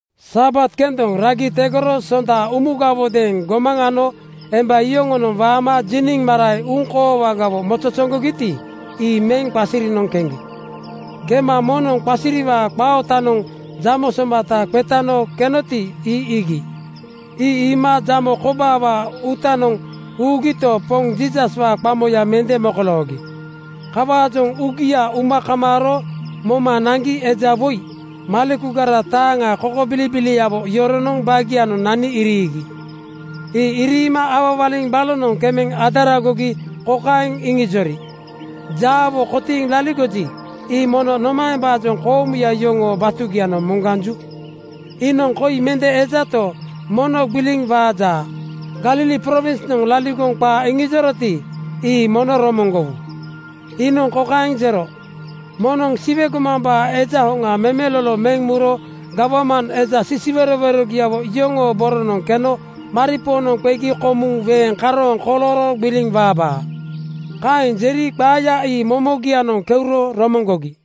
Sabat kendoŋ ragi tegoro Sonda umugawodeeŋ gomaŋ ano emba yoŋonoŋ waama jiniŋ marae uŋkoowagawo mozozoŋgogiti, ii meŋ qasirinoŋ keŋgi. Kema moŋnoŋ qasiriwaa qaa ootanoŋ jamo somata qetano kenoti, ii iigi. Ii iima jamo kobaawaa uutanoŋ ugito, Poŋ Jiisaswaa qamoya mende mokoloogi. Kawaajoŋ uugia uma kamaaro moma naŋgi eja woi malekugara taaŋa kokobilibiliawo yoronoŋ bagianoŋ nani iriigi. Ii iriima awawaliŋ balonoŋ kemeŋ adaragogi kokaeŋ iŋijori, “Jaawo kotiiŋ laligoji, ii mono nomaembaajoŋ koomuya yoŋoo batugianoŋ moŋganju? Iinoŋ koi mende ejato, mono gbiliŋ waaja. Galili prowinsnoŋ laligoŋ qaa iŋijoroti, ii mono romoŋgowu: Iinoŋ kokaeŋ jero, ‘Moŋnoŋ Siwe gomambaa Eja hoŋa memelolo meŋ muro gawman eja sisiwerowerogiawo yoŋoo boronoŋ keno maripoonoŋ qegi komuŋ weeŋ karooŋ kolooro gbiliŋ waabaa.’” Kaeŋ jeri qaaya ii momogianoŋ keuro romoŋgogi.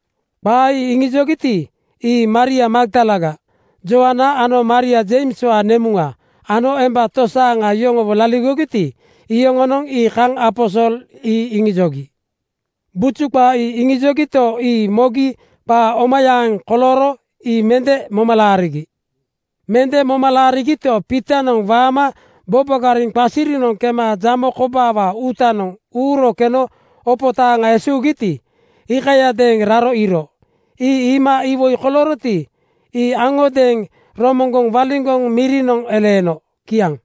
Qaa ii iŋijogiti, ii Maria Magdalaga, Joana ano Maria Jeimswaa nemuŋa ano emba tosaaŋa yoŋowo laligogiti, iyoŋonoŋ ii kaŋ aposol ii iŋijogi. Buju qaa ii iŋijogito, ii mogi qaa omayaaŋ kolooro ii mende moma laarigi. Mende moma laarigito, Piitonoŋ waama bobogariŋ qasirinoŋ kema jamo kobaawaa uutanoŋ uuro keno opo taaŋa esuugiti, iikayadeeŋ raro iiro. Ii iima iwoi kolooroti, ii aŋodeeŋ romoŋgoŋ waliŋgoŋ mirinoŋ eleeno. Kiaŋ.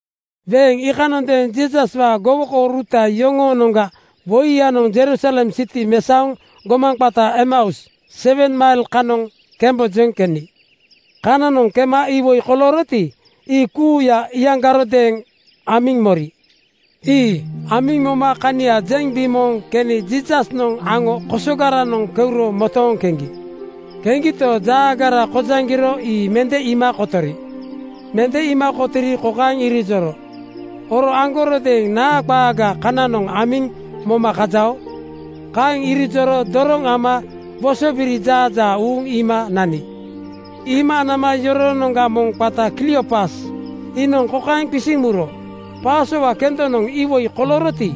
Weeŋ iikanondeeŋ Jiisaswaa gowokouruta yoŋoonoŋga woiyanoŋ Jerusalem siti mesaoŋ gomaŋ qata Emeus sewen mail kanoŋ kembojoŋ keni. Kananoŋ kema iwoi kolooroti, ii kuuya iyaŋgarodeeŋ amiŋ mori. Ii amiŋ moma kania jeŋ bimooŋ keni Jiisasnoŋ aŋo kosogaranoŋ keuro motooŋ keŋgi. Keŋgito, jaagara kojaŋgiro ii mende iima kotori. Mende iima kotori kokaeŋ irijoro, “Oro aŋgarodeeŋ naa qaaga kananoŋ amiŋ moma kajao?” Kaeŋ irijoro doroŋ ama wosobiri jaajaa uuŋ iima nani. Iima nama yoroonoŋga moŋ qata Kliopas iinoŋ kokaeŋ qisiŋ muro, “Pasowa kendonoŋ iwoi kolooroti,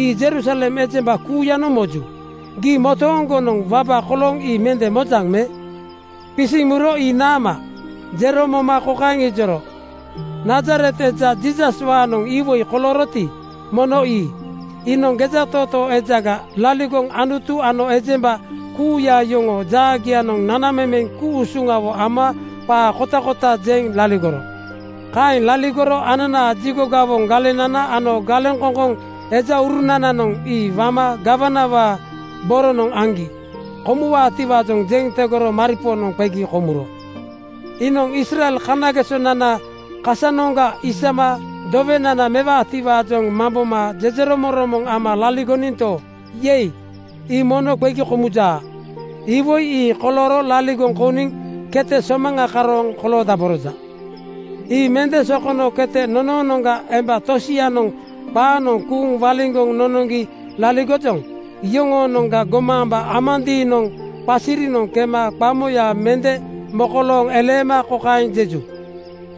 ii Jerusalem ejemba kuuyanoŋ moju. Gii motooŋgonoŋ wabaga kolooŋ ii mende mojaŋ me?” Qisiŋ muro “Ii naama?” jero moma kokaeŋ ijori, “Nazaret eja Jiisaswaanoŋ iwoi kolooroti, mono ii. Iinoŋ gejatootoo ejaga laligoŋ Anutu ano ejemba kuuya yoŋoo jaagianoŋ nanamemeŋ ku-usuŋawo ama qaa kotakota jeŋ laligoro. Kaeŋ laligoro ananaa jigo gawoŋ galenana ano galeŋkoŋkoŋ ejaurunananoŋ ii wama gawanawaa boronoŋ aŋgi komuwaatiwaajoŋ jeŋ tegoro maripoonoŋ qegi komuro. Iinoŋ Israel kanagesonana kasanoŋga isama dowenana mewaatiwaajoŋ mamboma jejeromoŋromoŋ ama laligoninto, ‘Yei!’ Ii mono qegi komujaa. Iwoi ii kolooro laligoŋ kouniŋ kete somaŋa karooŋ koloodaboroja. “Ii mende sokono kete nonoonoŋga emba tosianoŋ qaanoŋ kuuŋ waliŋgoŋ nonoŋgi laligojoŋ. Yoŋonoŋ gomaamba amandiinoŋ qasirinoŋ kema qamoya mende mokolooŋ eleema kokaeŋ jejuya,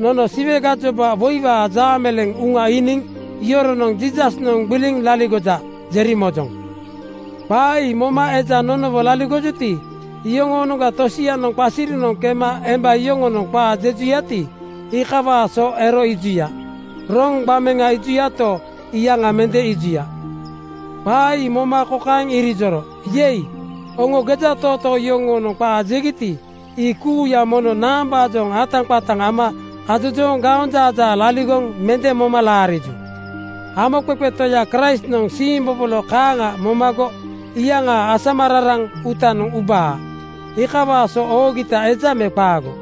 ‘Nono Siwe gajoba woiwaa jaameleeŋ uŋa iiniŋ yoronoŋ ‘Jiisasnoŋ gbiliŋ laligoja,’ jeri mojoŋ. Qaa ii moma eja nonowo laligojuti, iyoŋoonoŋga tosianoŋ qasirinoŋ kema emba yoŋonoŋ qaa jejuyati, iikawaa so ero iijuya. Roŋ gbameŋa iijuyato, iyaŋa mende iijuya.” Qaa ii moma kokaeŋ irijoro, “Yei! Oŋo gejatootoo yoŋonoŋ qaa jegiti, ii kuuya mono naambaajoŋ ataqataŋ ama ajojooŋ gaonjaajaa laligoŋ mende moma laariju? Hamoqeqe Toya Kraistnoŋ siimbobolo kaaŋa momago iyaŋaa asamararaŋ uutanoŋ ubaa. Iikawaa so oogita eja me qaago?”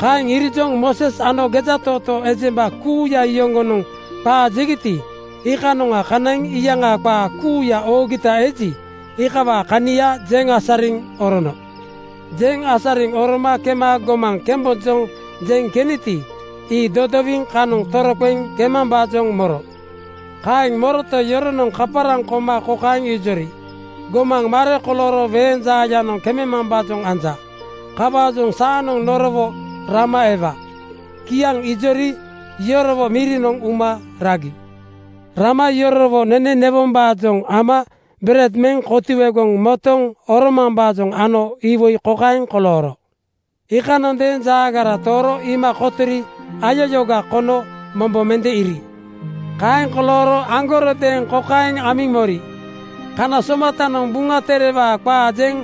Kaeŋ irijoŋ Mooses ano gejatootoo ejemba kuuya yoŋonoŋ qaa jegiti, iikanoŋa kanaiŋ iyaŋaa qaa kuuya oogita eji, iikawaa kania jeŋ asariŋ orono. Jeŋ asariŋ oroma kema gomaŋ kembojoŋ jeŋ keniti, ii dodowiŋ kanoŋ toroqeŋ kemambaajoŋ moro. Kaeŋ moroto, yoronoŋ kaparaŋ koma kokaeŋ ijori, “Gomaŋ mare kolooro weeŋ jaayanoŋ kememambaajoŋ anja. Kawaajoŋ saanoŋ norowo rama ewa.” Kiaŋ ijori yorowo mirinoŋ uma ragi. Rama yorowo nene newombaajoŋ ama bered meŋ kotuegoŋ motoŋ oromambaajoŋ ano iwoi kokaeŋ kolooro: Iikanondeeŋ jaagaranoŋ tooro iima kotori ayayooga kono mombo mende iiri. Kaeŋ kolooro aŋgarodeeŋ kokaeŋ amiŋ mori, “Kana somatanoŋ Buŋa Terewaa qaa jeŋ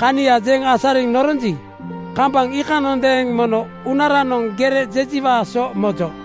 kania jeŋ asariŋ noronji, kambaŋ iikanondeeŋ mono uunaranoŋ gere jejiwaa so mojo.”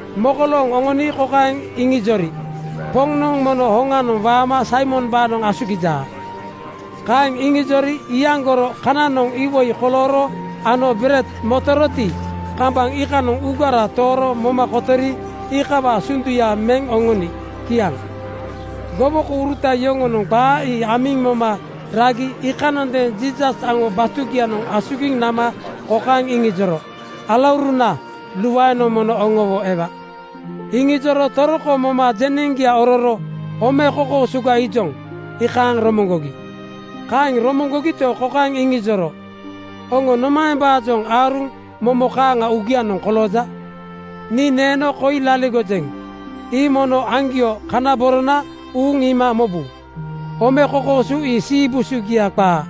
Mokolooŋ oŋoni kokaeŋ iŋijori, “Poŋnoŋ mono hoŋa waama Saimombaanoŋ asugijaa.” Kaeŋ iŋijori iyaŋgoro kananoŋ iwoi kolooro ano bered motoroti, kambaŋ iikanoŋ uugara tooro moma kotori, iikawaa sunduya meŋ oŋoni. Kiaŋ. Gowokouruta yoŋonoŋ qaa ii amiŋ moma ragi iikanondeeŋ Jiisas aŋo batugianoŋ asugiŋ nama kokaeŋ iŋijoro, “Alauruna, luaenoŋ mono oŋowo ewa!” Kaeŋ iŋijoro toroko moma jeneŋgia ororo “Ome kokoosuga iijoŋ,” iikaaŋ romoŋgogi. Kaeŋ romoŋgogito, kokaeŋ iŋijoro, “Oŋo nomaembaajoŋ aaruŋ momo kaaŋa uugianoŋ kolooja? Nii neeno koi laligojeŋ. Ii mono aŋgio kana borona uuŋ iima mobu. Ome kokoosu ii siibusugia qaa.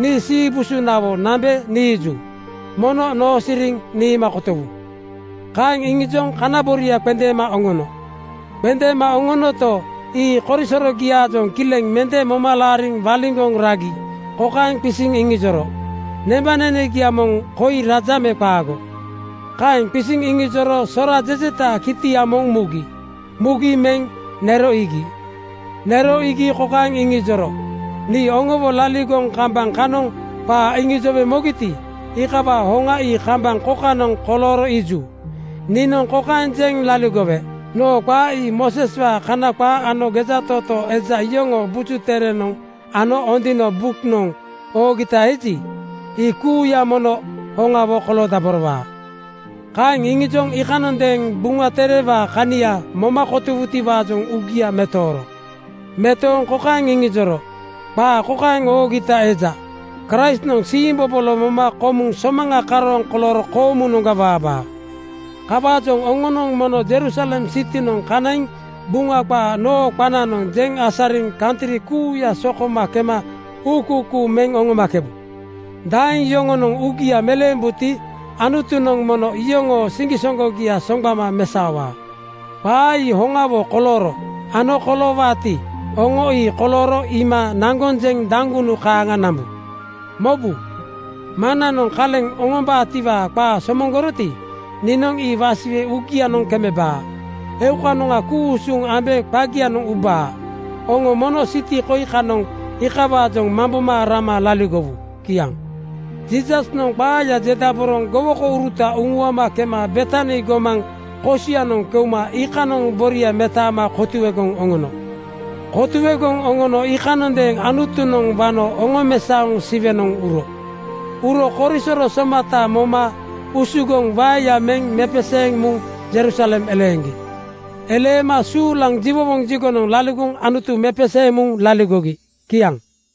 Nii siibusunawo nambe niiju. Mono noosiriŋ niima kotowu.” Kaeŋ iŋijoŋ kana boria qendeema oŋono. Qendeema oŋonoto, ii korisorogiaajoŋ kileŋ mende moma laariŋ waliŋgoŋ ragi kokaeŋ qisiŋ iŋijoro, “Nembanenegia moŋ koi raja me qaago?” Kaeŋ qisiŋ iŋijoro sora jejetaa kitia moŋ mugi. Mugi meŋ nero iigi. Nero iigi kokaeŋ iŋijoro, “Nii oŋowo laligoŋ kambaŋ kanoŋ qaa iŋijowe mogiti, iikawaa hoŋa ii kambaŋ kokanoŋ kolooro iiju. Niinoŋ kokaeŋ jeŋ laligowe: Noo qaa ii Mooseswaa Kana qaa ano gejatootoo eja yoŋoo Buju Tere ano Ondino (Buŋa rii) buknoŋ oogita eji, ii kuuya mono hoŋawo koloodaborowaa.” Kaeŋ iŋijoŋ iikanondeeŋ Buŋa Terewaa kania moma kotowutiwaajoŋ uugia metooro. Metooŋ kokaeŋ iŋijoro, “Qaa kokaeŋ oogita eja: Kraistnoŋ siimbobolo moma komuŋ somaŋa karooŋ kolooro koomunoŋga waabaa. Kawaajoŋ oŋonoŋ mono Jerusalem sitinoŋ kanaiŋ Buŋa qaa noo qananoŋ jeŋ asariŋ kantri kuuya sokoma kema uukuukuu meŋ oŋomakebu. Daeŋ yoŋonoŋ uugia meleembuti, Anutunoŋ mono iyoŋoo siŋgisoŋgogia soŋgbama mesaowaa. “Qaa ii hoŋawo kolooro ano koloowaati, oŋo ii kolooro iima naŋgoŋ jeŋ daŋgunu kaaŋa nambu. Mobu! Maŋnanoŋ kaleŋ oŋombaatiwaa qaa somoŋgoroti, niinoŋ ii wasiwe uugianoŋ kemebaa. Eukanoŋa ku-usuŋ ambe qagianoŋ ubaa. Oŋo mono siti koi kanoŋ iikawaajoŋ mamboma rama laligowu.” Kiaŋ. Jiisasnoŋ qaaya jedaboroŋ gowokouruta uŋuama kema Betani gomaŋ kosianoŋ keuma iikanoŋ boria metaama kotuegoŋ oŋono. Kotuegoŋ oŋono iikanondeeŋ Anutunoŋ wano oŋomesaoŋ Siwenoŋ uro. Uro korisoro somata moma usugoŋ waeya meŋ mepeseeŋ muŋ Jerusalem eleeŋgi. Eleema suulaŋ jiwowoŋ jigonoŋ laligoŋ Anutu mepeseeŋ muŋ laligogi. Kiaŋ.